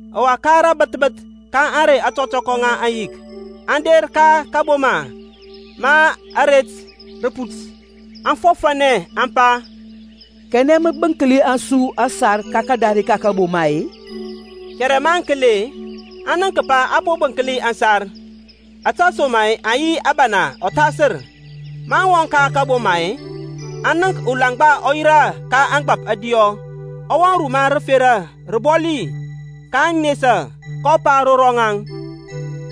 Ɔwa ka bəth bəth ka ȧŋrey ȧtɔtɔkɔ ŋa ȧŋyik, aŋ der ka kȧboma ma aret rə put. Aŋ fɔfȧnɛ aŋ pa, Kanɛ mə bənklɛ su ȧŋsar ka kadare ka kaboma-e? Kɛrɛ maŋ kəli-e, aŋ nənk kəpa a po bənkli aŋsar; ȧtesoma-e aŋ yi abana ɔthasər. Maŋ wɔŋ ka kaboma-e, aŋ nənk ulaŋgba ɔ yirȧ ka ȧŋgbȧp ȧdiyɔ, ɔ wɔŋ ruma rəfera rəbɔli, kaŋ nesa. kɔ pa ro rɔŋaŋ,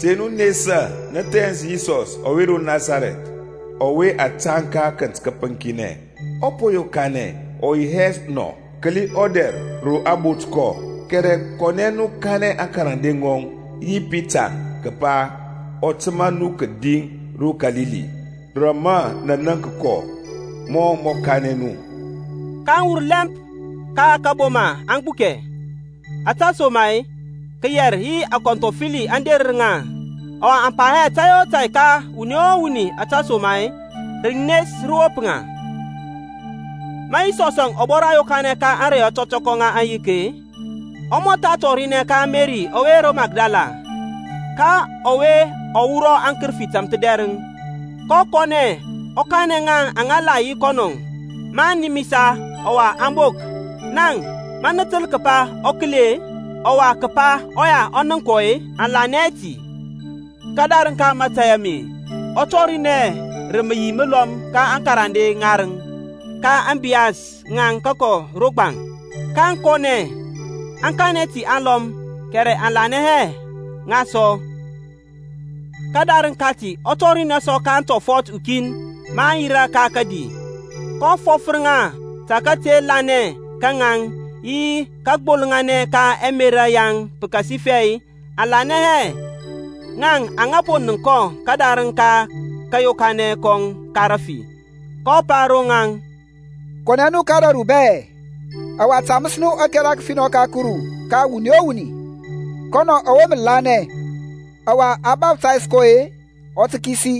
Te nu nesa; nə thɛns Yisɔs ɔwe ro Nasarɛth, ɔwe a tȧŋ ka akənt kəpəŋkinɛ. Ɔ po yokanɛ; ɔ yi hɛ nɔ. Kəli ɔdɛr ro a bot kɔ. Kɛrɛ kɔnɛ nu, kanɛ aŋkarande ŋɔŋ yi Pitaŋ kəpa ɔ təmȧ nu kədi ro Kalili, rə mə nə nənk kɔ mɔ mɔ kanɛ nu. kaŋ wur lɛmp ka kȧboma aŋ gbukɛ, ȧtesoma-e kəyɛr yi akɔnthɔfəli aŋ derər ŋa, ɔwa aŋ pa hɛ tȧy o tȧy ka wuni o wuni ȧtesoma-e rənes rə wop ŋa. Ma Yisɔsȧŋ ɔ bɔra yokanɛ ka ȧŋrey ȧtɔtɔkɔ ŋa aŋyik-e, ɔ mɔtha tɔrinɛ ka Meri ɔwe ro Makdala, ka ɔwe ɔ wurɔ akərəfi tȧmthədɛrəŋ. kɔ kɔnɛ ɔ kanɛ ŋa aŋa la yi yi kɔnɔ maŋ nimisa ɔwa aŋ bok. Ŋaŋ, maŋ təl kəpa ɔ kəli-e, ɔwa kəpa ɔya ɔ nənk kɔ-e aŋ lanɛ hɛ ti. Kədarəŋ ka mȧtȧy ame ɔ tɔrinɛ rə məyi məlɔm ka akarande ŋarəŋ ka ȧŋbiyas ŋaŋ kəkɔ ro gbaŋ. kaŋ kɔnɛ aŋ kanɛ ti ka aŋlɔm, kɛrɛ aŋ lanɛ hɛ ŋa sɔ. Kədarəŋ kati ɔ tɔrinɛ sɔ ka aŋtɔfɔt ukin ma aŋ yirȧ ka kədi, kɔ fɔfər ŋa ta kate lanɛ ka ŋaŋ yi kagbolŋanɛ ka ɛmerȧ yaŋ pəkasifɛ aŋ lanɛ hɛ ŋa aŋa po nənk kɔ kədarəŋ ka kȧyokanɛ kɔŋ ka rafi. kɔ pa ro ŋaŋ, Kɔnɛ nu ka ȧdȧru bɛ, ɔwa taməs nu ȧkɛra kəfinɔ ka Kuru ka wuni o wuni. Kɔnɔ ɔwe mə lanɛ, ɔwa a baftays kɔ-e, ɔ tə kisi,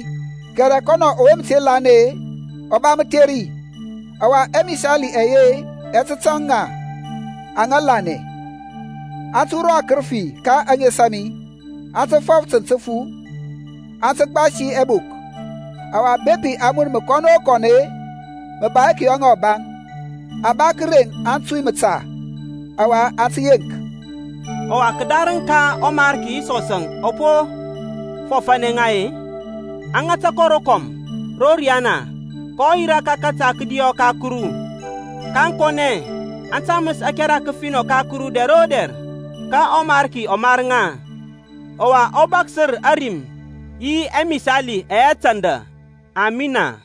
kɛrɛ kɔnɔ ɔwe mə te lanɛ-e, ɔ ba mətheri. Ɔwa ɛmisali ɛye ɛ tə tȧŋ ŋa aŋa lanɛ; aŋ tə wurɔ akərəfi ka ȧŋes a mi; aŋ tə fɔf tənt təfu; aŋ tə gbasi ɛbok; ɔwa bepi aŋ mun məkɔn o kɔn-e, mə ba hɛ tə kəyɔ ŋa ɔbaŋ; aŋ ba kəreŋ aŋtui məta, ɔwa aŋ tə yeŋk. Ɔwa kədarəŋ ka ɔMarki Yisɔsȧŋ ɔ po fɔfȧnɛ ŋa-e, a ŋata kɔ rokɔm ro riyana, kɔ yirȧ ka kȧta kədiɔ ka Kuru. kaŋ kɔnɛ, aŋ taməs ȧkɛra kəfinɔ ka Kuru dɛr o dɛr, ka ɔMarki ɔ mar ŋa, ɔwa ɔ bȧksər ȧrim yi ɛmisali ɛyɛ tanda. Amina.